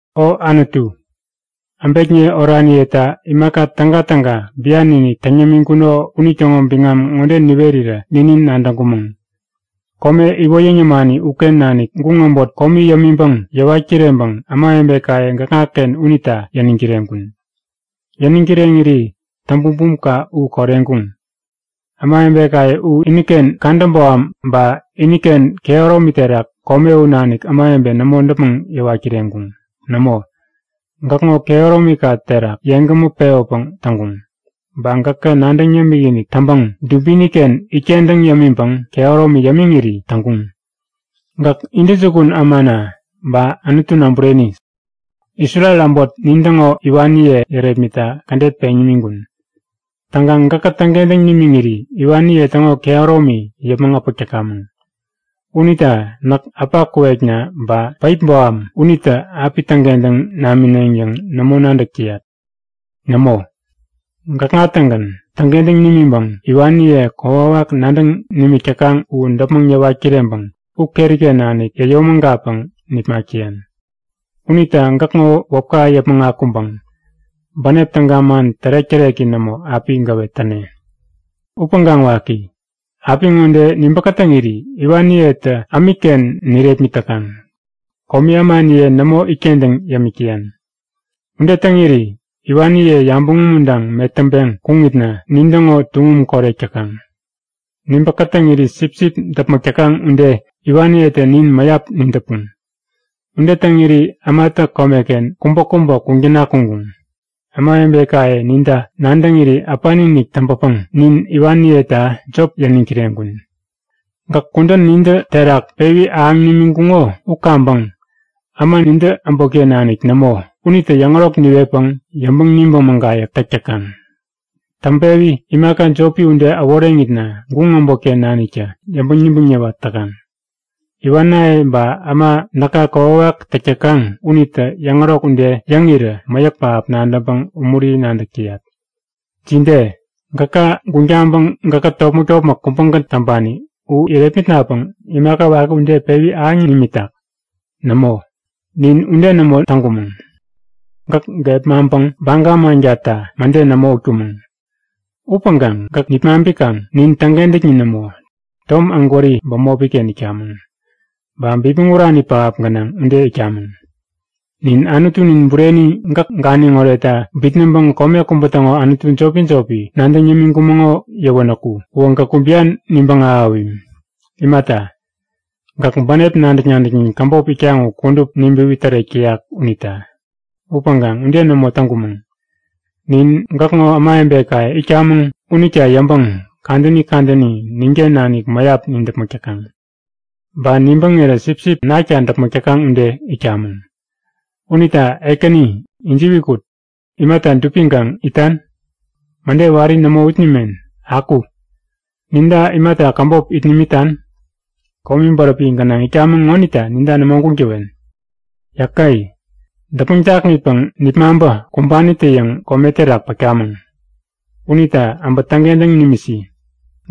O Anutu, äbekniye oraniyeta imaka tägatäga bian-inik täŋ yämiŋkuno unitäŋo biŋam ŋode niwerirä ninin nadäŋkumäŋ. Kome iwoyäŋ yämani uken nanik guŋ äbot komi yämiŋpäŋ yäwat kireŋpäŋ ämawebekaye gäkŋaken unita yäniŋ kireŋkun. Yäniŋ kireŋiri täŋ-bumbumka u koreŋkuŋ. Ämawebekaye u iniken kadä boham ba iniken kehäromi terak kome u nanik ämawebe nämo däpmäŋ yäwat kireŋkuŋ. Nämo, gäkŋo kehäromika terak yeŋgämä pewäpäŋ täŋkuŋ. Ba gäkä nadäŋ yämik-inik täŋpäŋ dubiniken itkentäŋ yämiŋpäŋ kehäromi yämiŋiri täŋkuŋ. Gäk intäjukun ämana ba Anutuna bureni. Isrel äbot nintäŋo iwaniye yärepmitta kädet peŋ nimiŋkun. Täŋkaŋ gäkä täŋkentäŋ nimiŋiri iwaniye täŋo kehäromi yäpmäŋ äpäk täkamäŋ. Unita näk äpa kuwekna ba päip boham unitä api täŋkentäŋ namineŋ yäŋ nämo nadäk täyat. Nämo, gäkŋa-tägän täŋkentäŋ nimiŋpäŋ iwaniye kokwawak nadäŋ nimik täkaŋ u däpmäŋ yäwat kireŋpäŋ u keriken nanik yäyomägatpäŋ nipmak täyan. Unita gäkŋo wäpka yäpmäŋ akuŋpäŋ bänep täga man tärek-täreki nämo api gäwet täne. Upäŋkaŋ waki, apiŋode nibä kätäŋiri iwaniyetä ämikken nirepmit täkaŋ. Komi ämaniye nämo itkentäŋ yämik täyan. Ude täŋiri iwaniye yabäŋ umuntaŋ metäŋpeŋ kuŋitna nintäŋo tuŋum korek täkaŋ. Nibä kätäŋiri sipsip däpmäk täkaŋ ude iwaniyetä nin mäyap nidäpuŋ. Ude täŋiri ämatä komeken kubäkubä kuŋ täna kuŋkuŋ. Ämawebekaye ninta nadäŋiri äpani-inik täŋpäpäŋ nin iwaniyeta jop yäniŋ kireŋkun. Gäk kudän nintä terak pewi ahäŋ nimiŋkuŋo u kaŋpäŋ, äma nintä äbotken nanik nämo unitä yäŋärok niwetpäŋ yäŋpäŋ-nibäŋ mägayäk täk täkaŋ. Täŋpewi imaka jopi ude äworeŋitna guŋ äbotken naniktä yäŋpäŋ-nibäŋ niwat täkaŋ. Iwanaye ba äma näka kokwawak täk täkaŋ unitä yäŋärok ude yäŋirä mäyäk pähap nadäŋpäŋ umuri nadäk täyat. Jide? Gäka guŋ taŋpäŋ gäkkät topmäk-topmäk kubägän täŋpani u irepmitnapäŋ imaka waki ude pewi ahäŋ nimitak? Nämo, nin ude nämo täŋkumäŋ. Gäk gepmaŋpäŋ baga mankata mäde nämo utkumäŋ. Upäŋkaŋ gäkä nipmaŋpikaŋ nin täŋkentäknin nämo, tom ägwäri bämopiken itkamäŋ. Ba bipmäŋurani pähap gänaŋ ude itkamäŋ. Nin Anutunin bureni gäk ganiŋ oretta bitnäŋpäŋ kome kubä täŋo anutu jopi-jopi nadäŋ yämiŋkumäŋo yäwänäku uwä gäkku bian nibäŋ ahäwim. Imata, gäk bänep nadäk-nadäknin käbop itkaŋ u kudup nibäwi tärek täyak unita. Upäŋkaŋ ude nämo täŋkumäŋ! Nin gäkŋo ämawebekaye itkamäŋ unita yäŋpäŋ kadäni kadäni ninken nanik mäyap nidäpmäk täkaŋ. Ba nibäŋirä sipsip nakta däpmäk täkaŋ ude itkamäŋ. Unita Ekäni ijiwi kut! Imata dupiŋkaŋ itan? Mäde wari nämo ut nimen. Aku! Ninta imata käbop it nimitan? Komi bäräpi gänaŋ itkamäŋ ŋonita ninta nämo guŋ täwen. Yäke! Däpmäŋ jakŋitpäŋ nipmaŋpä kumbanitä-yäŋ kome terak pätkamäŋ. Unita äbä täŋkentäŋ nimisi!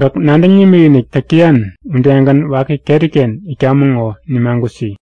Gäk nadäŋ nimikinik täk täyan udegän waki keriken itkamäŋ ŋo nimagutsi!